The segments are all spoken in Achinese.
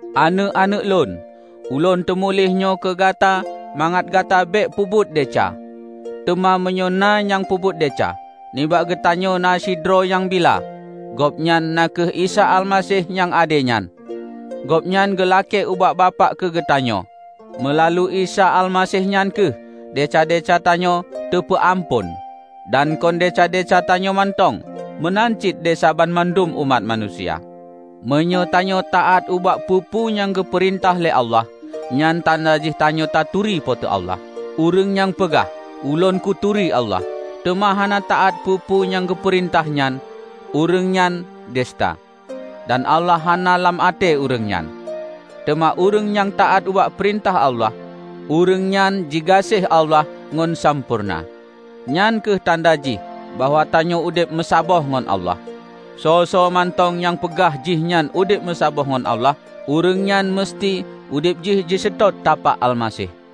Aneuëk-aneuëk lôn! Ulôn teumuléh nyoe keugata mangat gata bék peubuet desya. Teuma meunyoe na nyang peubuet desya, nibak geutanyoe na sidroe nyang bila, Gobnyan na kheueh Isa Almaseh nyang ade nyan; Gobnyan geulakée ubak Bapak keu geutanyoe. Meulalu Isa Almaseh nyan kheueh desya-desya tanyoe teupeuamphon. Dan kon desya-desya tanyoe mantong, meunan cit desya banmandum umat manusia. Meunyoe tanyoe taát ubak peue-peue nyang geupeurintah lé Allah, nyan tanda jih tanyoe taturi Po teu Allah. Ureuëng nyang peugah, "Ulôn kuturi Allah," teuma hana taát peue-peue nyang geupeurintah nyan, ureuëng nyan duseuta, dan Allah hana lam até ureuëng nyan. Teuma ureuëng nyang taát ubak peurintah Allah, ureuëng nyan jigaséh Allah ngon sampoereuna. Nyan kheueh tanda jih bahwa tanyoe udeb meusaboh ngon Allah. Soe-soe mantong nyang peugah jihnyan udeb meusaboh ngon Allah, ureuëng nyan meuseuti udeb jih jiseutôt tapak Almaseh.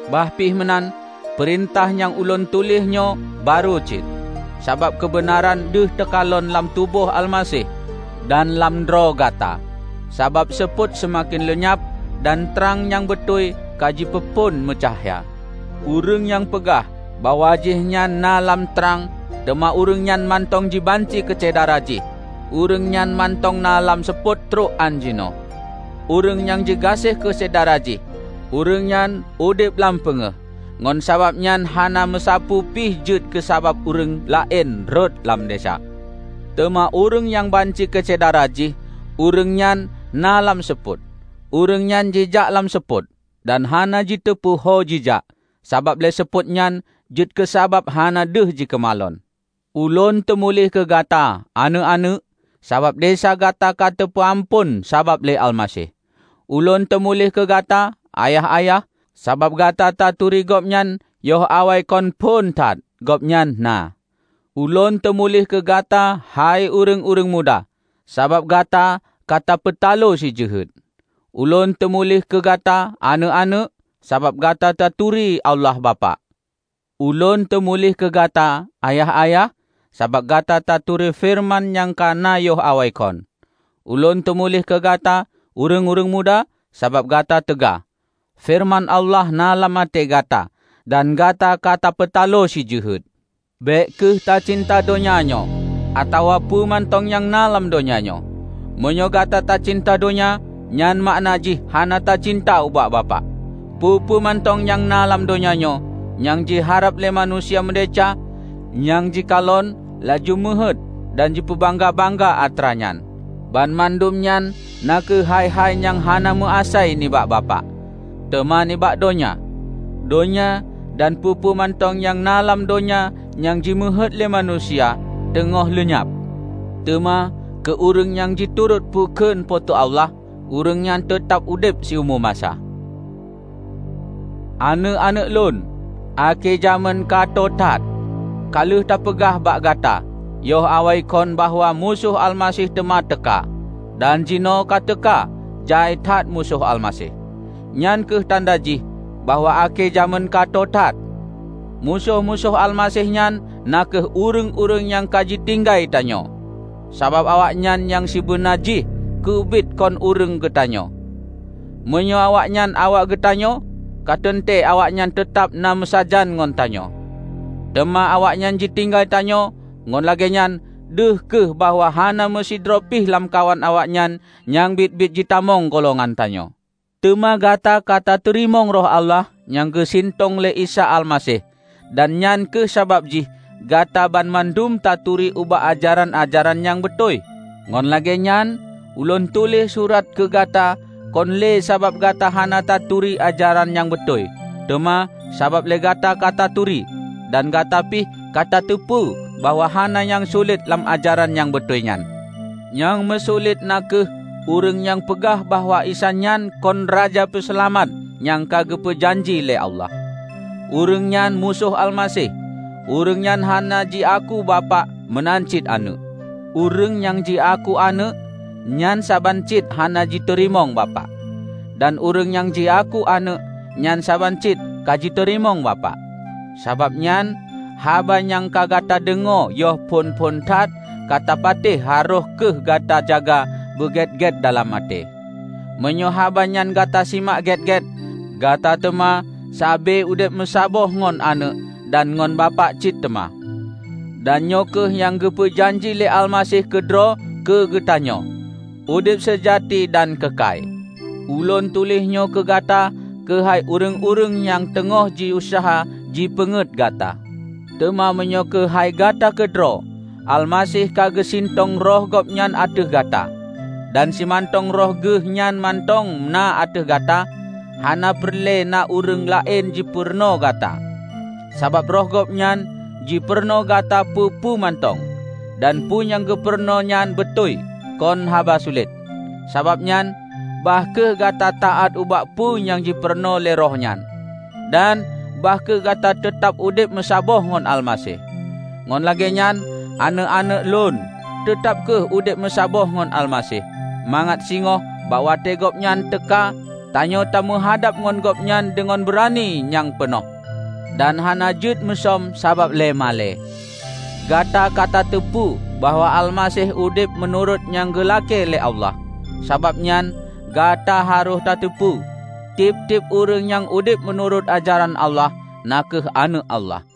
Bah pih meunan, peurintah nyang ulôn tuléh nyoe barô cit; sabab keubeunaran deuh teukalon lam tuboh Almaseh dan lam droe gata. Sabab seupôt seumaken leunyab dan trang nyang beutôi ka jipeuphon meucahya. Ureuëng nyang peugah bahwa jihnyan na lam trang teuma ureuëng nyan mantong jibanci keusyedara jih, ureuëng nyan mantong na lam seupôt trok ánjinoe. Ureuëng nyang jigaséh keusyedara jih, ureuëng nyan udeb lam peungéh ngon sabab nyan hana meusapeue pih jeuet keusabab ureuëng laén rhot lam desya. Teuma ureuëng nyang banci keu syedara jih, ureuëng nyan na lam seupôt. Ureuëng nyan jijak lam seupôt, dan hana jiteupeue ho jihjak, sabab lé seupôt nyan jeuet keusabab hana deuh jikeumalon. Ulôn teumuléh keugata, Aneuëk-aneuëk, sabab desya gata ka teupeuamphon sabab lé Almaseh. Ulôn teumuléh keugata, Ayah-ayah, sabab gata taturi Gobnyan yoh awaikon phon that Gobnyan na. Ulôn teumuléh keugata hai Ureuëng-ureuëng muda, sabab gata ka tapeutalo Si jeuhet. Ulôn teumuléh keu gata, Aneuëk-aneuëk, sabab gata taturi Allah Bapak. Ulôn teumuléh keu gata, Ayah-ayah, sabab gata taturi Feureuman nyang ka na yoh awaikon. Ulôn teumuléh keu gata, Ureuëng-ureuëng muda, sabab gata teuga. Feureuman Allah na lam até gata, dan gata ka tapeutaloe Si Jeuhet. Bék kheueh tacinta donya nyoe, atawa peue mantong nyang na lam donya nyoe. Meunyoe gata tacinta donya, nyan makna jih hana tacinta ubak Bapak. Peue-peue mantong nyang na lam donya nyoe -- nyang jiharab lé manusia meudesya, nyang jikalon laju meuheuét dan jipeubangga-bangga atra nyan -- banmandum nyan na kheueh hai-hai nyang hana meuasai nibak Bapak, teuma nibak donya. Donya dan peue-peue mantong nyang na lam donya nyang jimeuheuet lé manusia, teungoh leunyab. Teuma keu ureuëng nyang jiturot peukheun Po teu Allah, ureuëng nyan teutab udeb siumu masa. Aneuëk-aneuëk lôn, akhé jamén katho that! Ka lheueh teupeugah bak gata yoh awaikon bahwa Musoh Almaseh teuma teuka; dan jinoe ka teuka jai that musoh Almaseh. Nyan kheueh tanda jih bahwa akhé jamén ka tho that. Musoh-musoh Almaseh nyan na kheueh ureuëng-ureuëng nyang ka jitinggai tanyoe, sabab awaknyan nyang sibeuna jih keubiet kon ureuëng geutanyoe. Meunyoe awaknyan awak geutanyoe, ka teuntée awaknyan teutab na meusajan ngon tanyoe. Teuma awaknyan jitinggai tanyoe, ngon lagée nyan deuh kheueh bahwa hana meusidroe pih lamkawan awaknyan nyang biet-biet jitamong golongan tanyoe. Teuma gata ka tateurimong Roh Allah nyang geusintong lé Isa Almaseh dan nyan kheueh sabab jih gata banmandum taturi ubak ajaran-ajaran nyang beutôi. Ngon lagée nyan, ulôn tuléh surat keu gata kon lé sabab gata hana taturi ajaran nyang beutôi, teuma sabab lé gata ka taturi, dan gata pih ka tateupeue bahwa hana nyang sulet lam ajaran nyang beutôi nyan. Nyang meusulet na kheueh ureuëng nyang peugah bahwa Isa nyan kon Raja Peuseulamat nyang ka geupeu janji lé Allah. Ureuëng nyan Musoh Almaseh; ureuëng nyan hana jiaku Bapak meunan cit Aneuëk. Ureuëng nyang jiaku Aneuëk, nyan saban cit hana jiteurimong Bapak. Dan ureuëng nyang jiaku Aneuëk, nyan saban cit ka jiteurimong Bapak. Sabab nyan, haba nyang ka gata deungoe yoh phon-phon that ka tapatéh harôh kheueh gata jaga beugét-gét dalam até. Meunyoe haba nyan gata simak gét-gét, gata teuma sabe udeb meusaboh ngon Aneuëk dan ngon Bapak cit teuma. Dan nyoe kheueh nyang geupeu janji lé Almaseh keudroe keugeutanyoe; udeb seujati dan keukai. Ulôn tuléh nyoe keugata keuhai ureuëng-ureuëng nyang teungoh jiuseuha jipeungét gata. Teuma meunyoe keuhai gata keudroe, Almaseh ka geusintong Roh Gobnyan ateueh gata. Dan simantong Roh Geuhnyan mantong na ateueh gata, hana peureulée na ureuëng laén jipurunoe gata. Sabab Roh Gobnyan jipurunoe gata peue-peue mantong; dan peue nyang geupurunoe nyan beutôi, kon haba sulet. Sabab nyan, bah kheueh gata taát ubak peue nyang jipurunoe lé Roh nyan, dan bah kheueh gata teutab udeb meusaboh ngon Almaseh. Ngon lagée nyan, aneuëk-aneuëk lôn, teutab kheueh udeb meusaboh ngon Almaseh, mangat singoh bak watée Gobnyan teuka, tanyoe tameuhadab ngon Gobnyan deungon beurani nyang peunoh, dan hana jeuet musöm sabab lé malée. Gata ka tateupeue bahwa Almaseh udeb meunurot nyang geulakée lé Allah, sabab nyan gata harôh tateupeue, tieb-tieb ureuëng nyang udeb meunurot ajaran Allah na kheueh aneuëk Allah.